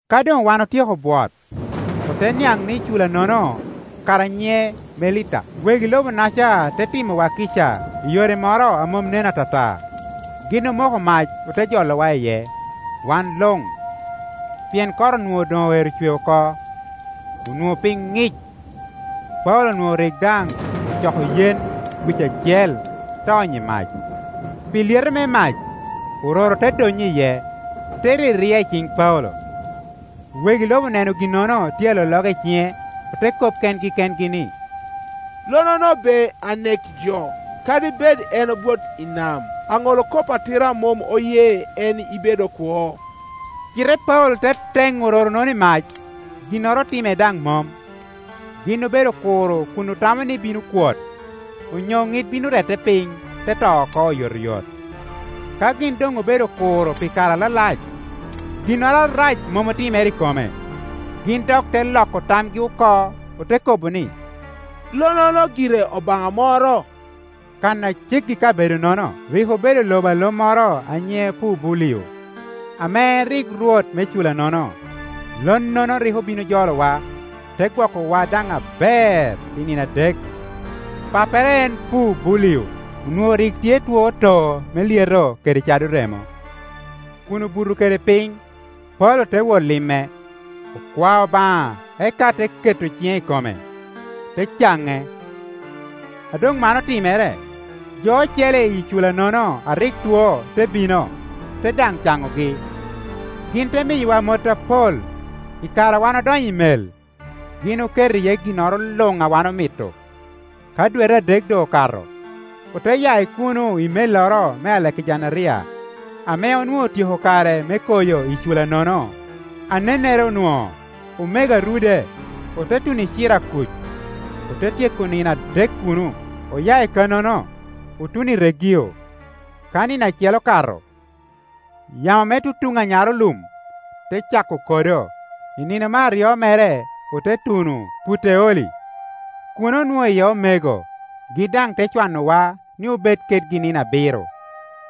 Ka doŋ wan otyeko bwot, ote niaŋ ni cula-nono kara nyiŋe Melita. Wegi lobo-naca te timowa kica i yore moro a mom nen atata. Gin omoko mac ote jolowa iye, wan luŋ, pien kot onwoŋo doŋ oero cwe oko, onwoŋo piny ŋic. Paulo onwoŋo rik daŋ ocoko yen wic acel te onyo i mac; pi lyeto me mac, ororo te donnyo iye, te riria i ciŋ Paulo. Wegi lobo oneno ginnono tye alologa i ciŋe, ote kop kengi kengi ni, “Lonnono be anek jo. Kadi bed en obwot i nam, aŋolkop atira mom oye en ibedo kwo.” Cite Paulo te teŋo ororo-nono i mac, ginnoro otime daŋ mom. Gin obedo kuro kun otamo ni bino kwot, onyo ŋit bino rette piny te to oko oyotoyot; ka gin doŋ obedo kuro pi kare alalac, ginnoro arac mom otimere i kome, gin dok te loko tamgi oko, ote kobo ni, lonnono gire obaŋa moro. Kan a ceggi i bedoka-nono, rik obedo lobo a lo moro a nyiŋe Pubulio, ame en rik rwot me cula-nono. Lonnono rik obin ojolowa, te gwokowa daŋ aber pi nino adek. Pappere en Pubulio onwoŋo rik tye two too me lyeto kede cado remo, kun obuto kede piny. Paulo te wot lime; okwao Obaŋa eka te keto ciŋe i kome, te caŋe. A doŋ man otimere, jo ocele i cula-nono a rik two te bino, ote daŋ caŋogi. Gin te miyowa mot apol; i kare a wan odonyo i mel, gin oketo iye ginnoro luŋ a wan omito. Ka dwete adek doŋ okato, ote ya i kuno i melloro me Alegejanderia ame onwoŋo otyeko kare me koyo i cula-nono anennere onwoŋo, “Omego a Rude.” Ote tuno i Cirakuc, ote tyeko nino adek kuno. Oya i kannono, otuno i Regio; ka nino acel okato, yamo me tutuŋ anyarolum te cako kodo, i nino me aryo mere ote tuno Puteoli. Kuno onwoŋo iye omego, gin daŋ te cwanowa ni obed kedgi nino abiro.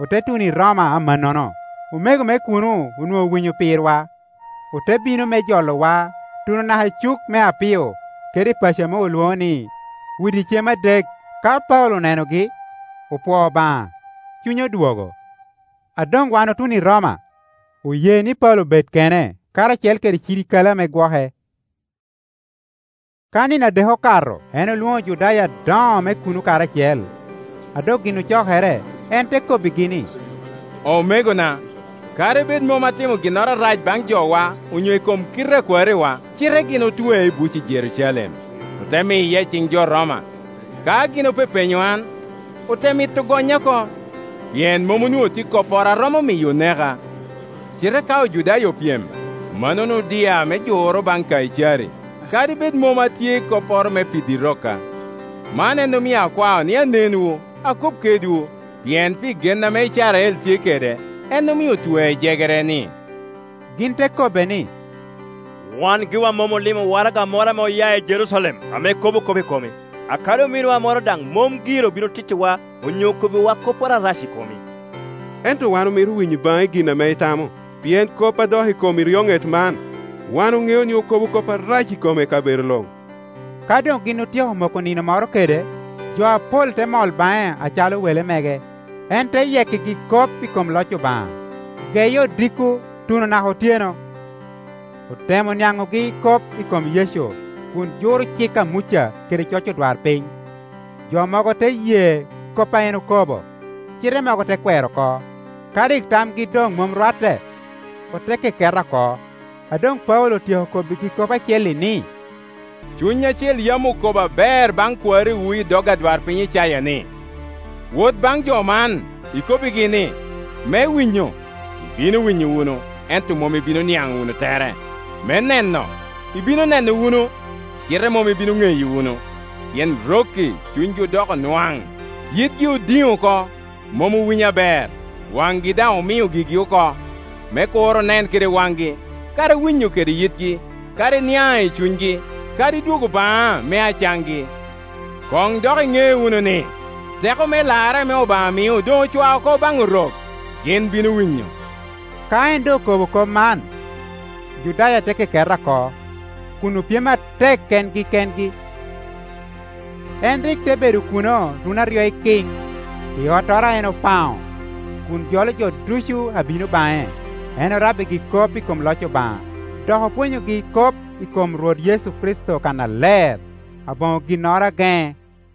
Ote tuno i Roma amannono. Omego me kuno onwoŋo owinyo pirwa, ote bino me jolowa tuno naka i Cuk me Appio kede i paco ame olwoŋo ni, Udi Cem Adek. Ka Paulo onenogi, opwoo Obaŋa, cunye odwogo. A doŋwan otuno i Roma, oye ni Paulo bed kene, karacel kede cirikale ame gwoke. Ka nino adek okato, en olwoŋo Ojudaya adoŋo me kuno karacel; a doŋ gin ocokere, en te kobbigi ni, “Omegona, kadi bed mom atimo ginnoro arac baŋ jowa onyo i kom kite a kwariwa, cite gin otwea i buc i Jerucalem, ote miya iciŋ jo Roma. Ka gin opepenyo an, ote mito gonya oko, pien mom onwoŋo tye kopporo a romo miyo oneka. Cite ka Ojudaya opyem, mannono odia me juro baŋ Kaicari, kadi bed mom atye kopporo me piddi rokka. Man en omio akwao ni anenwu, akob kedwu, pien pi gen ame Icrael tye kede, en omio otwea i jegere-ni.” Gin te kobbe ni, “Wan giwa mom olimo waraga moro ame oya i Jerucalem ame kobo kop i komi, akadi ominwa moro daŋ mom gire obino otittiwa onyo okobbiwa kopporo arac i komi. Ento wan omito winyo i baŋi gin ame itamo, pien kop a dok i kom eryoŋet man, wan oŋeo ni okobo kop arac i kome i kabedo luŋ.” Ka doŋgin otyeko moko nino moro kede, jo apol te mol baŋe acalo wele mege. En te yekkigi kop i kom loc Obaŋa, geye odiko tuno naka otyeno. Otemo niaŋogi kop i kom Yecu kun juro cik a Muca kede coc odwarpiny. Jo mogo te ye kop a en okobo, cite mogo te kwero oko. Ka rik tamgi doŋmom rwatte, ote ke keta oko, a doŋ Paulo otyeko kobbigi kop acel-li, ni, “Cuny Acil yam okobo aber baŋ kwariwu i dog adwarpiny Icaya ni, ‘Wot baŋ jo man, ikobbigi ni, Me winyo, ibino winyo wunu, ento mom ibino niaŋ wunu tere, me neno, ibino neno wunu, cite mom ibino ŋeyo wunu, Pien rok-k i cunygi odoko nwaŋ, yitgi odiŋ oko, mom owinyo aber, waŋgi daŋ omio gigi oko; me kur onen kede waŋgi, kadi winyo kede yitgi, kadi niaŋ i cunygi, kadi dwogo baŋa me acaŋgi.’ Koŋ dok iŋe wunu ni, teko me larre ame Obaŋa mio doŋ ocwao oko baŋ Orok; gin bino winyo.” [ Ka en doŋokobo kop man, Ojudaya te keketa oko, kun opyem atek kengi kengi.] En rik te bedo kuno runi aryo ikiŋ, i ottoro a en opaŋo, kun jolo jo ducu a bino baŋe. En orabbigi kop i kom loc Obaŋa, dok opwonyogi kop i kom Rwot Yecu Kricito kannaler, aboŋo ginnoro a geŋe.